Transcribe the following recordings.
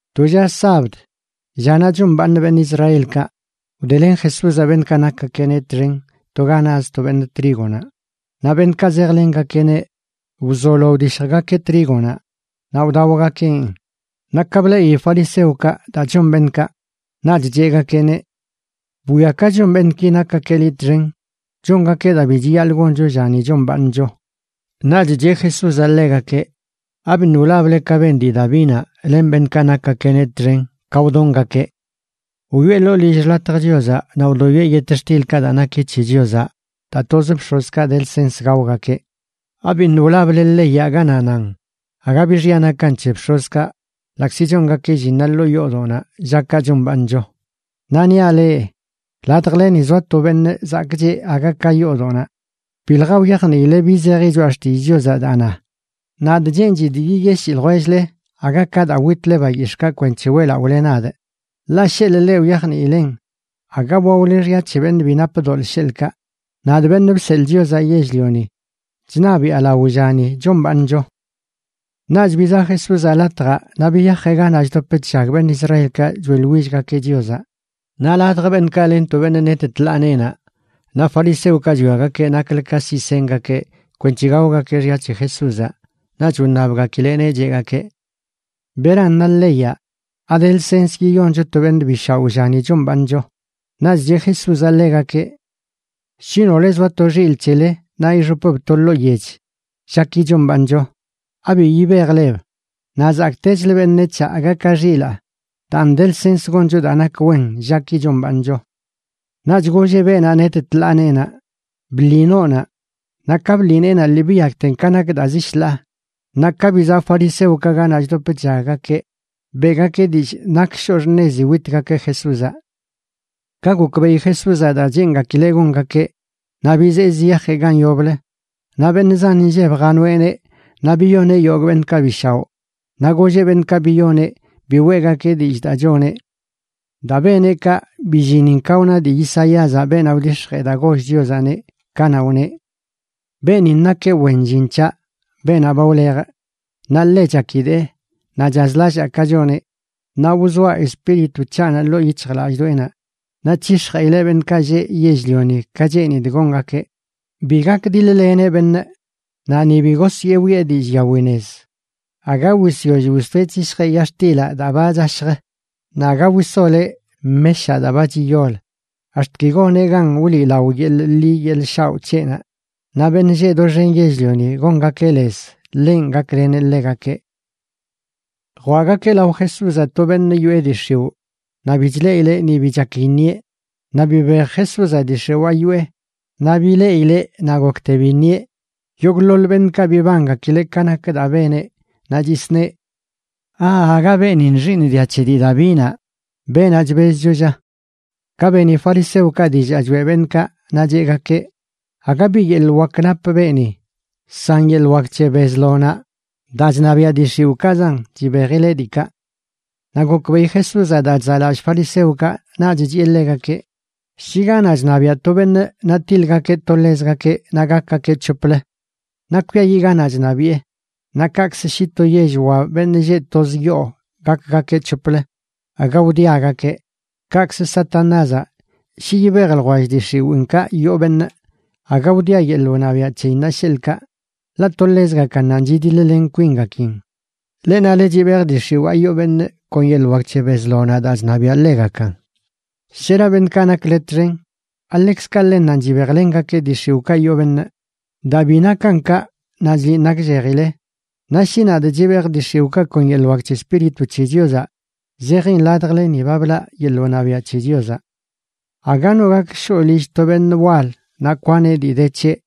To lla sabd, llanaꞌ chombaaṉ beṉꞌ Israelkaꞌ, wdelen Jesúzaꞌ beṉꞌkaꞌ nakgakeꞌneꞌ txen to ga naz to beṉꞌ trígonaꞌ, naꞌ beṉꞌkaꞌ zejlengakeꞌneꞌ wzolo wdishjgakeꞌ trígonaꞌ naꞌ wdaogakeꞌn. Naꞌ ka bleꞌi fariseokaꞌ daa chon beṉꞌkaꞌ, naꞌch cheꞌgakeꞌneꞌ: ―Bwia ka chon beṉꞌki nakgakeꞌ liꞌ txen, chongakeꞌ daa bi chiyaḻꞌ goncho llani chombaaṉcho. Naꞌch cheꞌ Jesúzaꞌ ḻegakeꞌ: ―¿Abiṉꞌ wlable ka ben dii Davinaꞌ len beṉꞌkaꞌ nakgakeꞌneꞌ txen ka wdongakeꞌ? Wyoꞌe ḻoo lill xḻatj Chiozaꞌ naꞌ wdoyoeꞌ yetxtilkaꞌ daa naki c̱he Chiozaꞌ daa toz bx̱ozkaꞌ de lsens gaogakeꞌ. ¿Abiṉꞌ wlable leyaꞌ ganaꞌ nan aga bi xya nakan c̱he bx̱ozkaꞌ ḻaꞌkzi chongakeꞌ llinnaꞌ ḻoo yoodoꞌnaꞌ llakaꞌ chombaaṉcho? Naꞌ niaꞌ leꞌ, ladjleni zoa to beṉꞌ zakꞌcheꞌ aga ka yoodoꞌnaꞌ. Bilja wyajniile bi zeji Choꞌa Xtillꞌ Chiozaꞌ daa na: “Nadꞌ cheenchidꞌ yiyeshii ljwell-le, aga ka daa witle bayix̱ꞌkaꞌ kwenc̱he weꞌlaꞌole nadꞌ.” Ḻaꞌ sheḻꞌ leꞌ wyajniilen, aga waole xya c̱he beṉꞌ bi nap doḻꞌ, sheḻꞌkaꞌ. Nadꞌ, Beṉꞌ Bseḻꞌ Chiozaꞌ Yell-lioni, chṉabiꞌa lao llani chombaaṉcho. Naꞌch bizaꞌ Jesúzaꞌ latjaꞌ, naꞌ biyajeꞌ ganaꞌ chdop chllag beṉꞌ Israelkaꞌ choeꞌḻwillgakeꞌ Chiozaꞌ. Naꞌ ladj beṉꞌkaꞌ len to beṉꞌ net tḻaa neenaꞌ. Naꞌ fariseokaꞌ chwiagakeꞌ naklə ka siꞌ sengakeꞌ kwenc̱he gaogakeꞌ xya c̱he Jesúzaꞌ, naꞌch wṉabgakileꞌneꞌ, cheꞌgakeꞌ: ―¿Beran na leyaꞌ? ¿Ade lsens yiyoncho to beṉꞌ bi shaoꞌ llani chombaaṉcho? Naꞌch cheꞌ Jesúzaꞌ ḻegakeꞌ: ―Shi nole zoa to xilꞌ c̱hele naꞌ ixopb to ḻoo yech llaki chombaaṉcho, ¿abi yibejleb? Naꞌ ¡zakꞌtechlə beṉec̱haꞌ aga ka xilaa! Daan de lsens goncho daa nak wen llaki chombaaṉcho. Naꞌch golleꞌ beenaꞌ net tḻaa neenaꞌ: ―Bḻi noonaꞌ. Naꞌ ka bḻi neenaꞌ lii biyakten ka nak daa zi shḻaa. Naꞌ ka bizaꞌ fariseokaꞌ ganaꞌ chdop chllaggakeꞌ, beꞌgakeꞌ dillꞌ nak shoꞌ xṉezi witgakeꞌ Jesúzaꞌ. Ka gokbeꞌi Jesúzaꞌ daa cheengakileꞌ gongakeꞌ, naꞌ bizee ziyajeꞌ gan yoblə. Naꞌ beṉꞌ zan inlleb janoeꞌneꞌ naꞌ biyoneꞌ yogꞌ beṉꞌkaꞌ bi shaoꞌ. Naꞌ golleꞌ beṉꞌkaꞌ biyoneꞌ bi weꞌgakeꞌ dillꞌ daa choneꞌ. Daa beneꞌ kaꞌ, billinin ka wna dii Isaíazaꞌ, beenaꞌ wdix̱jee daa goll Chiozaꞌneꞌ, kanaꞌ wneꞌ: Beenin nakeꞌ wen llin c̱haꞌ, beenaꞌ ba wlejꞌ, naꞌ ḻe chakidee naꞌ chazlallaa ka choneꞌ. Naꞌ wzoaꞌ Espíritu c̱haꞌnaꞌ ḻoo yic̱hjlallꞌdoꞌenaꞌ, naꞌ c̱hix̱jeꞌileꞌ beṉꞌkaꞌ lleꞌ yell-lioni ka cheenidꞌ gongakeꞌ. Bi gakdiḻ-leneꞌ beṉꞌ, naꞌ ni bi gosyee wiꞌe dillꞌ yawi nez. Aga wisyoll wistoeꞌ c̱hishjeꞌ yax̱tilaꞌ daa ba chashjə. naꞌ aga wisoleꞌ meshaꞌ daa ba chiyol, ax̱t ki goneꞌ gan wliꞌlao yeḻꞌ ḻi yeḻꞌ shaoꞌ c̱heꞌnaꞌ. Naꞌ beṉꞌ lleꞌ doxen yell-lioni gongakeꞌ lez ḻenꞌ gakleneꞌ ḻegakeꞌ. Jwaꞌgakeꞌ lao Jesúzaꞌ to beṉꞌ yoꞌe dii x̱iwꞌ naꞌ bi chleꞌileꞌ ni bi chak iṉieꞌ. Naꞌ bibej Jesúzaꞌ dii x̱iwaa yoꞌe, naꞌ bileꞌileꞌ naꞌ gokte biṉieꞌ. Yogꞌḻoḻ beṉꞌkaꞌ bibangakileꞌ ka nak daa beneꞌ, naꞌ chisneꞌ: ―¿Aaga beenin xiiṉ dia c̱he dii Davinaꞌ, beenaꞌ chbezcho, lla? Ka beni fariseokaꞌ dillaa choeꞌ beṉꞌkaꞌ, naꞌ cheꞌgakeꞌ: ―Aga bi yeḻꞌ wak nap beeni. San yeḻꞌ wak c̱he Bezlonaꞌ,a daa chṉabiaꞌ dii x̱iwꞌkaꞌzan, chibejileꞌ diikaꞌ. Naꞌ gokbeꞌi Jesúzaꞌ daa chzaꞌlallꞌ fariseokaꞌ, naꞌch chiꞌe ḻegakeꞌ: ―Shi ganaꞌ chṉabiaꞌ to beṉꞌ naꞌ tiḻgakeꞌ to ḻezgakeꞌ naꞌ gakgakeꞌ c̱hoplə, naꞌ kwiayiꞌ ganaꞌ chṉabiꞌe, naꞌ kaꞌkzə shi to yell wa beṉꞌ lleꞌ toz yoo gakgakeꞌ c̱hoplə aga wdiagakeꞌ. Kaꞌkzə Satanázaꞌ, shi yibej ljwell dii x̱iwiinkaꞌ yoo beṉꞌ, aga wdia yeḻꞌ wṉabiaꞌ c̱heyinnaꞌ, sheḻꞌkaꞌ, ḻaꞌ to ḻezgakannanꞌ chidiḻ-len kwingakin. Leꞌ nale chibejꞌ dii x̱iwaa yoo beṉꞌ kon yeḻꞌ wak c̱he Bezlonaꞌb daa chṉabiaꞌ ḻegakan. ¿Shera beṉꞌkaꞌ nakle txen? ¿Aḻekzkaꞌ ḻennanꞌ chibejlengakeꞌ dii x̱iwꞌkaꞌ yoo beṉꞌ? Daa bi nakan kaꞌ, naꞌ chliꞌn nakllejile. Naꞌ shi nadꞌ chibejꞌ dii x̱iwꞌkaꞌ kon yeḻꞌ wak c̱he Espíritu c̱he Chiozaꞌ zejin ladjleni ba blaꞌ yeḻꞌ wṉabiaꞌ c̱he Chiozaꞌ. ’Aga no gak shoꞌ lill to beṉꞌ wal naꞌ kwaneꞌ dii de c̱heꞌ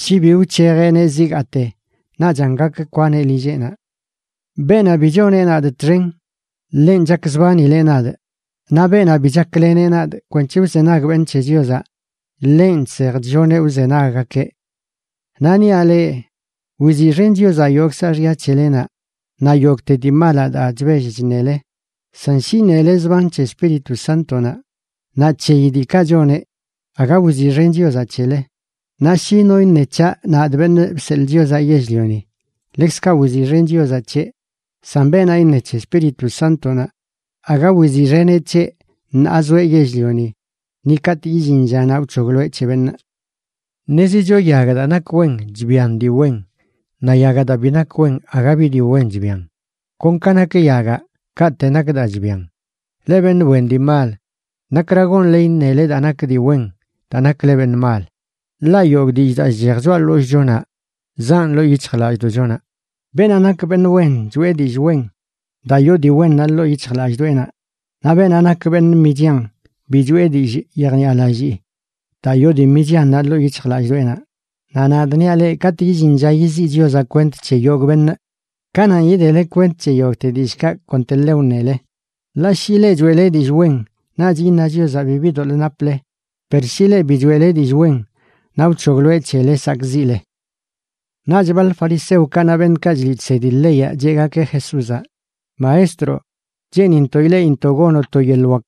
shi bi wc̱hejeꞌneꞌ zigaate. Naꞌchan gak kwaneꞌ lilleꞌnaꞌ. ’Beenaꞌ bi choneꞌ nadꞌ txen, ḻenꞌ chakzbanileꞌ nadꞌ; naꞌ beenaꞌ bi chakleneꞌ nadꞌ kwenc̱he wzenag beṉꞌ c̱he Chiozaꞌ, ḻenꞌ chsej chlloneꞌ wzenaggakeꞌ. ’Naꞌ niaꞌ leꞌ, wiziꞌxen Chiozaꞌ yogꞌ saaxya c̱helenaꞌ naꞌ yogꞌte dii malaꞌ daa chbell chṉele, san shi iṉele zban c̱he Espíritu Sántonaꞌ naꞌ c̱heyi diikaꞌ choneꞌ, aga wiziꞌxen Chiozaꞌ c̱hele. Naꞌ shi no iṉe c̱haꞌ, nadꞌ, Beṉꞌ Bseḻꞌ Chiozaꞌ Yell-lioni, ḻekzkaꞌ wiziꞌxen Chiozaꞌ c̱heꞌ, san beenaꞌ iṉe c̱he Espíritu Sántonaꞌ, aga wiziꞌxeneꞌ c̱heꞌ ṉaa zoeꞌ yell-lioni ni katꞌ illin llanaꞌ wc̱hogloeꞌ c̱he beṉꞌ. ’Ṉezicho yagaꞌ daa nak wen chbian dii wen, naꞌ yagaꞌ daa bi nak wen aga bi dii wen chbian. Kon ka nak yagaꞌ, kaꞌte nak daa chbian. ¡Leꞌ beṉꞌ wen dii mal! ¿Nakra gonle iṉele daa nak dii wen daa nakle beṉꞌ mal? Ḻaꞌ yogꞌ dillꞌ daa chchej choꞌa ḻollꞌchonaꞌ zaꞌn ḻoo yic̱hjlallꞌdoꞌchonaꞌ. Beenaꞌ nak beṉꞌ wen choꞌe dillꞌ wen, daa yoo dii wennaꞌ ḻoo yic̱hjlallꞌdoꞌenaꞌ; naꞌ beenaꞌ nak beṉꞌ michian bi choꞌe dillꞌ yejniꞌalallii, daa yoo dii michiannaꞌ ḻoo yic̱hjlallꞌdoꞌenaꞌ. Naꞌ nadꞌ niaꞌ leꞌ, katꞌ illin lla yiziꞌ Chiozaꞌ kwent c̱he yogꞌ beṉꞌ, kananꞌ yidele kwent c̱he yogꞌte dillꞌkaꞌ konteḻe wṉele. Ḻaꞌ shi leꞌ choeꞌle dillꞌ wen, naꞌch iṉa Chiozaꞌ bibi doḻꞌ naple; per shi leꞌ bi choeꞌle dillꞌ wen, naꞌ wc̱hogloeꞌ c̱hele sakꞌziꞌle. Naꞌch baḻ fariseokaꞌ naꞌ beṉꞌkaꞌ chliꞌ chsedi leyaꞌ cheꞌgakeꞌ Jesúzaꞌ: ―Maestro, cheenintoꞌ ileꞌintoꞌ gonoꞌ to yeḻꞌ wak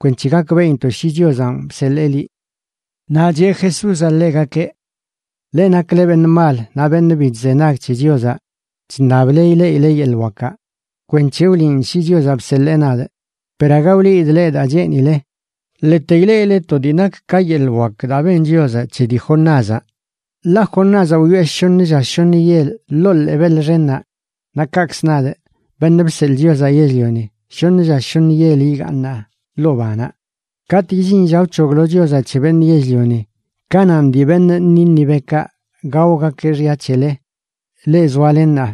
kwenc̱he gakbeꞌintoꞌ shi Chiozanꞌ bseḻee liꞌ. Naꞌ cheꞌ Jesúzaꞌ ḻegakeꞌ: ―Leꞌ nakle beṉꞌ mal naꞌ beṉꞌ bi chzenag c̱he Chiozaꞌ chṉable ileꞌileꞌ yeḻꞌ wakaꞌ kwenc̱he wliꞌn shi Chiozanꞌ bseḻee nadꞌ, per aga wliidꞌ leꞌ daa cheenile. Ḻete ileꞌile to dii nak ka yeḻꞌ wak daa ben Chiozaꞌ c̱he dii Jonázaꞌ. Ḻaꞌ Jonázaꞌ wyoꞌe shoṉə lla shoṉə yel ḻoo ḻee beḻ xennaꞌ, naꞌ kaꞌkzə nadꞌ, Beṉꞌ Bseḻꞌ Chiozaꞌ Yell-lioni, shoṉ lla shoṉ yel igaaṉaꞌ ḻoo banaꞌ. Katꞌ illin lla wc̱hoglo Chiozaꞌ c̱he beṉꞌ yell-lioni, kananꞌ dii beṉꞌ Nínivekaꞌ gaogakeꞌ xya c̱hele, leꞌ zoale ṉaa,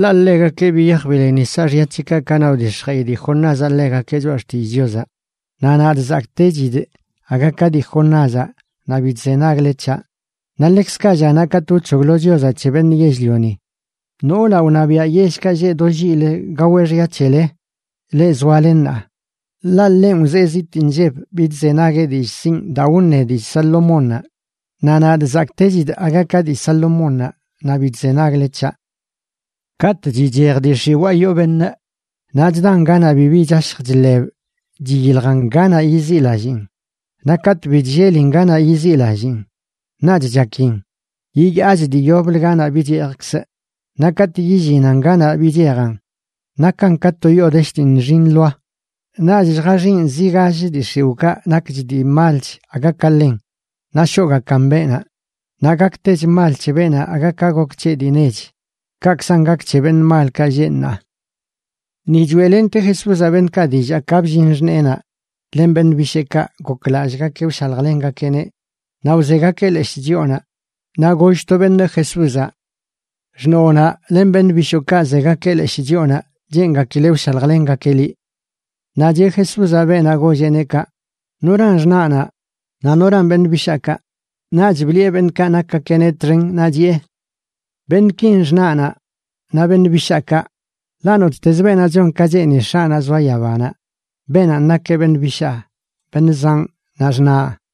ḻaꞌ ḻegakeꞌ biyaj bileni saaxya c̱heꞌkaꞌ kanaꞌ wdix̱jeꞌi dii Jonázaꞌ ḻegakeꞌ choꞌa xtillꞌ Chiozaꞌ. Naꞌ nadꞌ, zakꞌtechidꞌ aga ka dii Jonázaꞌ naꞌ bi chzenagle c̱haꞌ. Naꞌ ḻekzkaꞌ llanaꞌ katꞌ wc̱hoglo Chiozaꞌ c̱he beṉꞌ yell-lioni, noolaꞌ wṉabiaꞌ yellkaꞌ lleꞌ do lliꞌlə gaweꞌ xya c̱hele, leꞌ zoale ṉaa, ḻaꞌ ḻenꞌ wzee zitꞌ nlleb bidzenagueꞌ dillꞌ sinꞌ daa wṉe dii Salomónnaꞌ. Naꞌ nadꞌ, zakꞌtechidꞌ aga ka dii Salomónnaꞌ naꞌ bi chzenagle c̱haꞌ. ’Katꞌ chichej dii x̱iwaa yoo beṉꞌ, naꞌ chdan ganaꞌ bibi chashj chḻeb chyiljan ganaꞌ yiziꞌlalliin. Naꞌ katꞌ bi chllelin ganaꞌ yiziꞌlalliin, naꞌch chakin: “Yiyaachꞌ dii yoblə ganaꞌ bichejkzꞌ.” Naꞌ katꞌ yillinan ganaꞌ bichejan, nakan ka to yoo desh dii nxi nḻoa. Naꞌch lljaxiꞌn zi gall dii x̱iwꞌkaꞌ nakch dii malch aga ka ḻen, naꞌ shoꞌgakan beenaꞌ. Naꞌ gaktech mal c̱he beenaꞌ aga ka gok c̱heꞌ dii nech. Kaꞌkzan gak c̱he beṉꞌ malkaꞌ lleꞌ ṉaa. Ni choeꞌlente Jesúzaꞌ beṉꞌkaꞌ dillaa ka bllin xṉeenaꞌ len beṉꞌ bisheekaꞌ goklallꞌgakeꞌ wshaljlengakeꞌneꞌ naꞌ wzegakeꞌ leshꞌ chyoonaꞌ. Naꞌ goll to beṉꞌ Jesúzaꞌ: ―Xṉoonaꞌ len beṉꞌ bishookaꞌ zegakeꞌ leshꞌ chyoonaꞌ cheengakileꞌ wshaljlengakeꞌ liꞌ. Naꞌ cheꞌ Jesúzaꞌ beenaꞌ golleꞌneꞌ kaꞌ: ―¿Noran xṉaꞌnaꞌ naꞌ noran beṉꞌ bishaakaꞌ? Naꞌch bliꞌe beṉꞌkaꞌ nakgakeꞌneꞌ txen naꞌ chiꞌe: ―Beṉꞌkin xṉaꞌnaꞌ naꞌ beṉꞌ bishaakaꞌ. Ḻaꞌ nottezə beenaꞌ chon ka cheeni X̱aꞌnaꞌ zoa yabanaꞌ, beenanꞌ nakeꞌ beṉꞌ bishaa, beṉꞌ zanꞌ naꞌ xṉaꞌ.